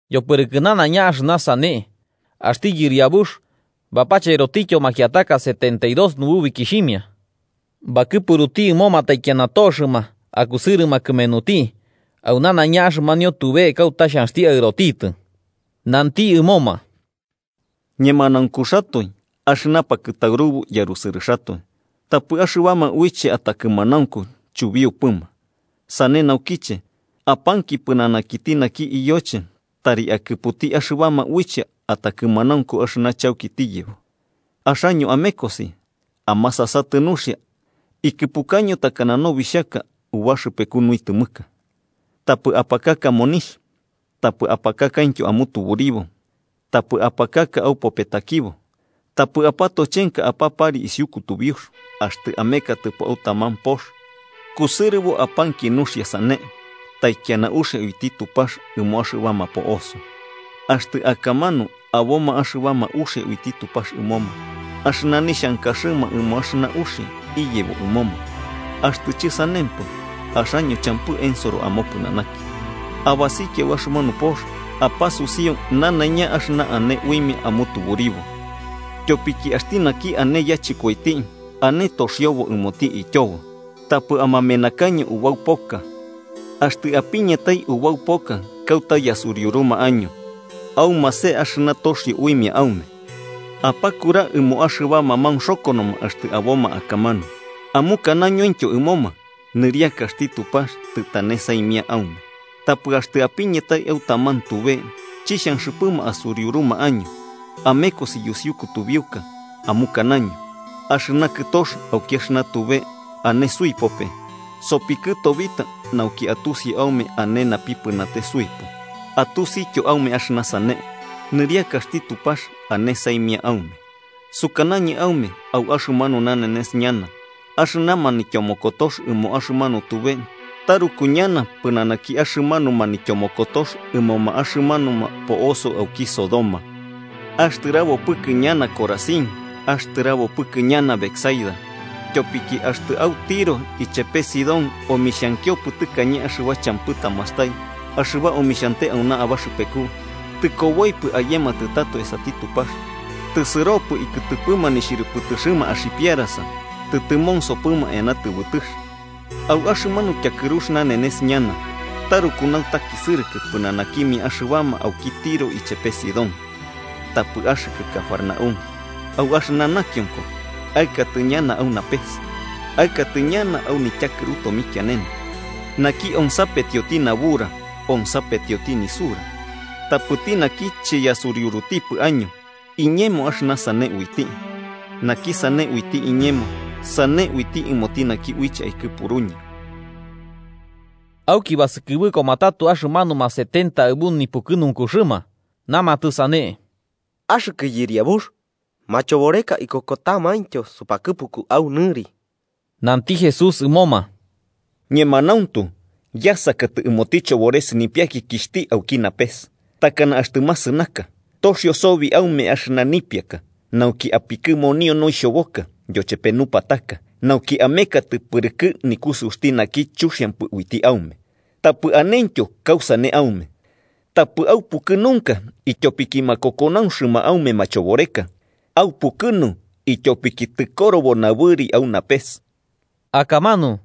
Yopɨrɨkɨ nanaiña axɨna sane, axti Yɨriabux bapacherotityo makiataka setenta y dos nububikixhimia, bakɨpuruti ɨmoma taikiana toxɨma akusɨrɨma kɨmenuti, au nanaiña axɨmanio tube kauta xhanxti aɨrotitɨ. Nanti ɨmoma: “Ñemanaunkuxatoe axɨna pakɨtaurubu yarusɨrɨxatoe, tapɨ axɨbama uiche atakɨmanaunku chubiupɨma. Sane naukiche, apanki pɨnanakiti naki Iyoche tari akɨputi axɨbama uiche atakɨmanaunku axɨna chauki tiyebo. Axaño amekosi. Amasasatɨ nuxia ikɨpukaño takana nobixhaka ubaxɨpeku nuitɨmɨka. Tapɨ apakaka monixh, tapɨ apakakaityo amutuburibo tapɨ apakaka aupopetakibo. Tapɨ apatochenka apapari isiu kutubiux. Axtɨ amekatɨpo au taman pox, kusɨrɨbo apanki nuxia, sane: ‘Taikiana uxia uiti Tupax ɨmo axɨbama po'oso.’ Axtɨ akamanu aboma axɨbama uxia uiti Tupax ɨmoma, axɨna nixhankaxɨma ɨmo axɨna uxia iyebo ɨmoma. Axtɨ chɨsanempɨ, axaño champɨ ensoro amopɨnanaki. Abasikia au axɨmanu pox, apasusiu nanaiña axɨna ane uimia amutuburibo, ityopiki axti naki ane yachɨkoiti ane toxiobo ɨmoti ityobo. Tapɨ amamenakaño ubau poka. Axtɨ apiñatai ubau poka kauta yasuriuruma año, aumase axɨna toxio uimia aume. Apakura ɨmoma axɨbama maunxokonoma axtɨ aboma akamanu amukanoñointyo ɨmoma: ‘Nɨriakaxti Tupax tɨtane saimia aume.’ Tapɨ axtɨ apiñatai au taman tube chixhanxɨpɨma asuriuruma año, amekosi yusiu kutubiuka amukanaño: ‘¡Axɨna kɨtox auki axɨna tube, sɨsio suipope, sopikɨtobita nauki atusi aume ane napipɨnate suipu! Atusityo aume axɨna sane, nɨriakaxti Tupax ane saimia aume.’ Sukanañɨ aume au axɨmanu nanenes ñana axɨna manityomokotox ɨmo axɨmanu tube taruku ñana pɨnanaki axɨmanu manityomokotox ɨmoma axɨmanuma po'oso auki Sodoma. “¡Axtɨrabopɨkɨ ñana, Corazín! ¡Axtɨrabopɨkɨ ñana, Betsaida! Tyopiki axtɨ au Tiro ichepe Sidón omixhankiompɨ tɨkañe axɨba champɨ tamastai axɨba omixhante auna abaxɨpeku, tɨkoboipɨ ayematɨ tato esati Tupax, tɨsɨropɨ ikɨtɨpɨma nixhɨrɨpɨtɨxɨma axipiarasa tɨtɨmonsopɨma eana tɨbɨtɨx. Au axɨmanu tyakɨrux nanenes ñana taruku nautakisɨrɨkɨ pɨnanakimia axɨbama auki Tiro ichepe Sidón. Tapɨ axɨkɨ, Cafarnaúm, ¿au axɨna nakionko aɨkatɨ ñana au napes? ¡Aɨkatɨ ñana au nityakɨru tomikianene! “Naki onsapetioti nabura, onsapetioti nisura. Tapɨti naki chiyasuriurutipɨ año, iñemo axɨna sane uiti. Naki sane uiti iñemo, sane uiti ɨmoti naki uiche aikɨpuruñɨ.” Auki basɨkɨbɨkoma tato axɨmanuma setenta aɨbu nipukɨnunkuxɨma, namatɨ sane: –¡Axɨkɨ Yɨriabux, machoboreka ikokotamaintyo supakɨpuku au nɨri! Nanti Jesús ɨmoma: –Ñemanauntu, yasakatɨ ɨmoti chobores nipiakikixhti auki napes takana axtɨ masɨnaka. Toxio sobi aume axɨna nipiaka nauki apikɨmonio noixhoboka yochepe nupataka, nauki amekatɨ pɨrɨkɨ nikusɨuxti naki chuxiampɨ uiti aume, tapɨ anentyo kausane aume. Tapɨ aupukɨnunka ityopiki makokonauxɨma aume machoboreka, aupukɨnu ityopiki tɨkorobo nabɨri au napes. Akamanu,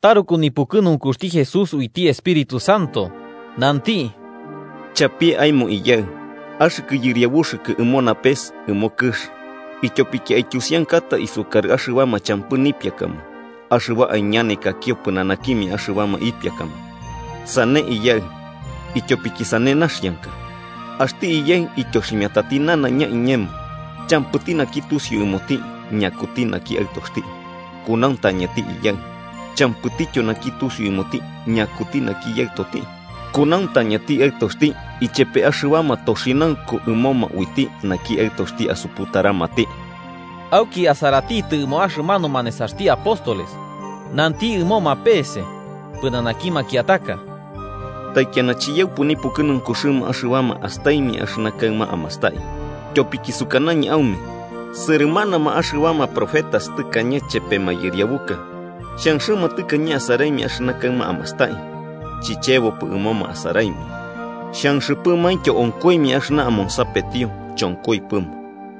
taruku nipukɨnunkuxti Jesús uiti Espíritu Santo, nanti: “Chapie aemo, Iyaɨ, axɨkɨ Yɨriabuxɨkɨ ɨmo napes ɨmo kɨx, ityopiki aityusiankata isukarɨ axɨbama champɨ nipiakama axɨba aiñanekakio pɨnanakimia axɨbama ipiakama. Sane, Iyaɨ, ityopiki sane naxianka. “Axti Iyaɨ ityoximiatati nanaiña iñemo. Champɨti naki tusiu ɨmoti ñakuti naki Aɨtoxti, kunauntañati Iyaɨ. Champɨtityo naki tusiu ɨmoti ñakuti naki Yaɨtoti, kunauntañati Aɨtoxti ichepe axɨbama toxinaunku ɨmoma uiti naki Aɨtoxti asuputaramati.” Auki asaratitɨ ɨmo axɨmanuma nesaxti apóstoles, nanti ɨmoma pese pɨnanaki makiataka: “Taikiana chiyaupɨ nipukɨnunkuxɨma axɨbama astaimia axɨna kaɨma amastai. Tyopiki sukanañɨ aume sɨrɨmanama axɨbama profetas tɨkañe chepe mayɨriabuka xhanxɨma tɨkañe asaraimia axɨna kaɨma amastai, chichebopɨ ɨmoma asaraimia. Xanxɨpɨmaintyo onkoimia axɨna amonsapetio, chonkoipɨma.”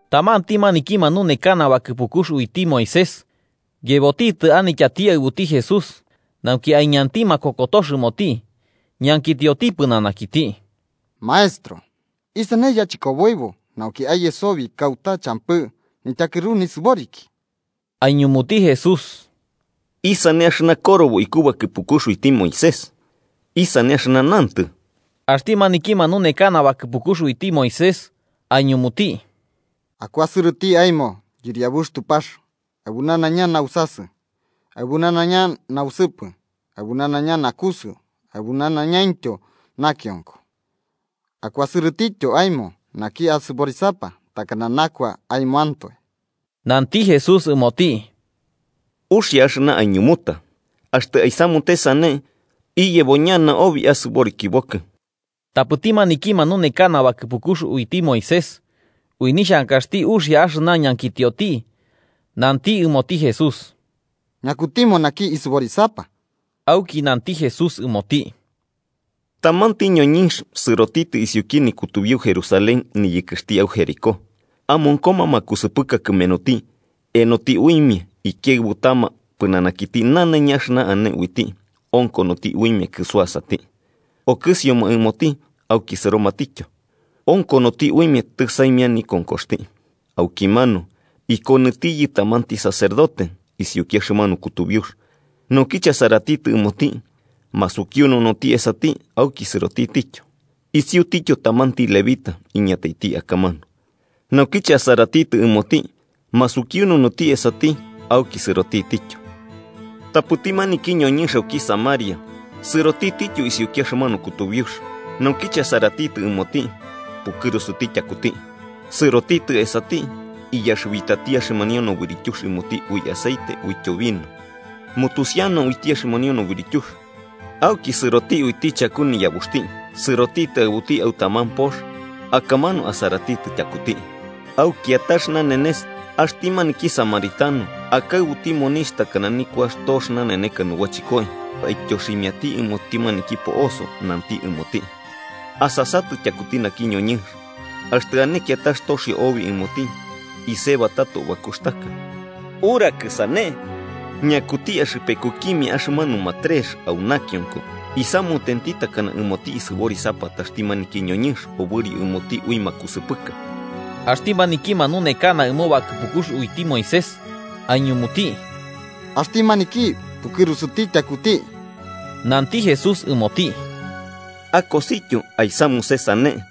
Tamanti maniki manunekana bakɨpukux uiti Moisés yebotitɨ anityati aɨbuti Jesús, nauki aiñanti makokotox ɨmoti ñankitioti pɨnanakiti: –Maestro, ¿isane yachɨkoboibo nauki aye sobi kauta champɨ nityakɨru nisɨboriki? Aiñumuti Jesús: –¿Isane axɨna korobo iku bakɨpukux uiti Moisés? ¿Isane axɨna nantɨ? Axti maniki manunekana bakɨpukux uiti Moisés aiñumuti: –‘Akuasɨrɨti aemo Yɨriabux Tupax aɨbu nanaiña nausasɨ, aɨbu nanaiña nausɨpɨ, aɨbu nanaiña nakusɨu aɨbu nanaiñaintyo nakionko.’ ‘Akuasɨrɨtityo aemo naki asɨborisapa takana nakua aemoantoe.’ Nanti Jesús ɨmoti: –Uxia axɨna aiñumuta. Axtɨ aisamute sane, iyebo ñana obi asɨborikibokɨ. Tapɨti maniki manunekana bakɨpukux uiti Moisés, ui nixhankaxti uxia axɨna ñankitioti, nanti ɨmoti Jesús: –¿Ñakutimo naki isɨborisapa? Auki nanti Jesús ɨmoti: –Tamanti ñoñɨnx sɨrotitɨ isiuki nikutubiu Jerusalén niyɨkɨxti au Jericó, amonkoma makusɨpɨka kɨmenuti enoti uimia ikiaɨbutama pɨnanakiti nanaiña axɨna ane uiti onkonoti uimia kɨsuasati. Okɨsioma ɨmoti auki sɨromatityo, onkonoti uimia tɨsaimia nikonkoxti. Aukimanu, ikonɨtiyɨ tamanti sacerdote isiuki axɨmanu kutubiux. Naukiche asaratitɨ ɨmoti, masukiununuti esati auki sɨrotitityo. Isiutityo tamanti levita iñataiti akamanu, naukiche asaratitɨ ɨmoti, masukiununuti esati auki sɨrotitityo. Tapɨti maniki ñoñɨnx auki Samaria sɨrotitityo isiuki axɨmanu kutubiux, naukiche asaratitɨ ɨmoti, pukɨrusuti tyakuti. Sɨrotitɨ esati, iyaxɨbitati axɨmanio nobɨrityux ɨmoti ui aceite uityo vino, mutusiana uiti axɨmanio nobɨrityux. Auki sɨroti uiti chaku niyabuxti, sɨrotitɨ aɨbuti au taman pox akamanu asaratitɨ tyakuti. Au kiatax nanenes, axti maniki samaritano akaɨbuti monixh takana nikuax tox naneneka nubachɨkoi, aityoximiati ɨmoti maniki po'oso nanti ɨmoti: ‘Asasatɨ tyakuti naki ñoñɨnx, axtɨ ane kiatax toxio obi ɨmoti, isebatato bakuxtaka.’ Urakɨ sane, ¿ñakuti axɨpekukimia axɨmanuma trex au nakionko isamutenti takana ɨmoti isɨborisapataxti maniki ñoñɨnx obɨrio ɨmoti ui makusɨpɨka? Axti maniki manunekana ɨmo bakɨpukux uiti Moisés aiñumuti: –Axti maniki pukɨrusuti tyakuti. Nanti Jesús ɨmoti: –Akosityo aisamuse sane.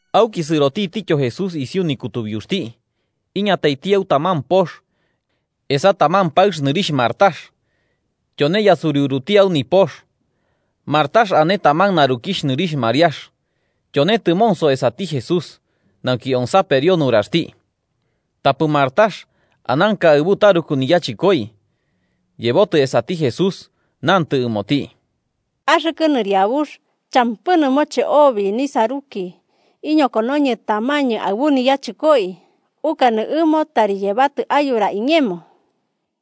Auki sɨrotitityo Jesús isiu nikutubiuxti iñataiti au taman pox, esa taman paɨx nɨrixh Marta tyone yasuriuruti au nipox. Marta ane taman narukixh nɨrixh Mariax, tyone tɨmonso esati Jesús, nauki onsaperio nuraxti. Tapɨ Marta, ananka aɨbu taruku niyachɨkoi, yebotɨ esati Jesús nantɨ ɨmoti: –Axɨkɨ Nɨriabux, ¿champɨ nɨmoche obi nisaruki iñokonoñɨ tamañɨ aɨbu niyachɨkoi? Ukanɨ ɨmo tari yebatɨ ayura iñemo.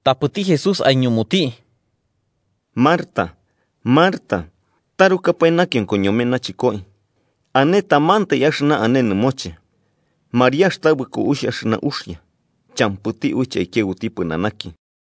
Tapɨti Jesús aiñumuti: –Marta, Marta, tarukapae nakionko ñome nachɨkoi, ane tamantai axɨna ane nɨmoche. Mariax tabɨko uixh axɨna uxia, champɨti uiche aikiaɨbu pɨnanaki.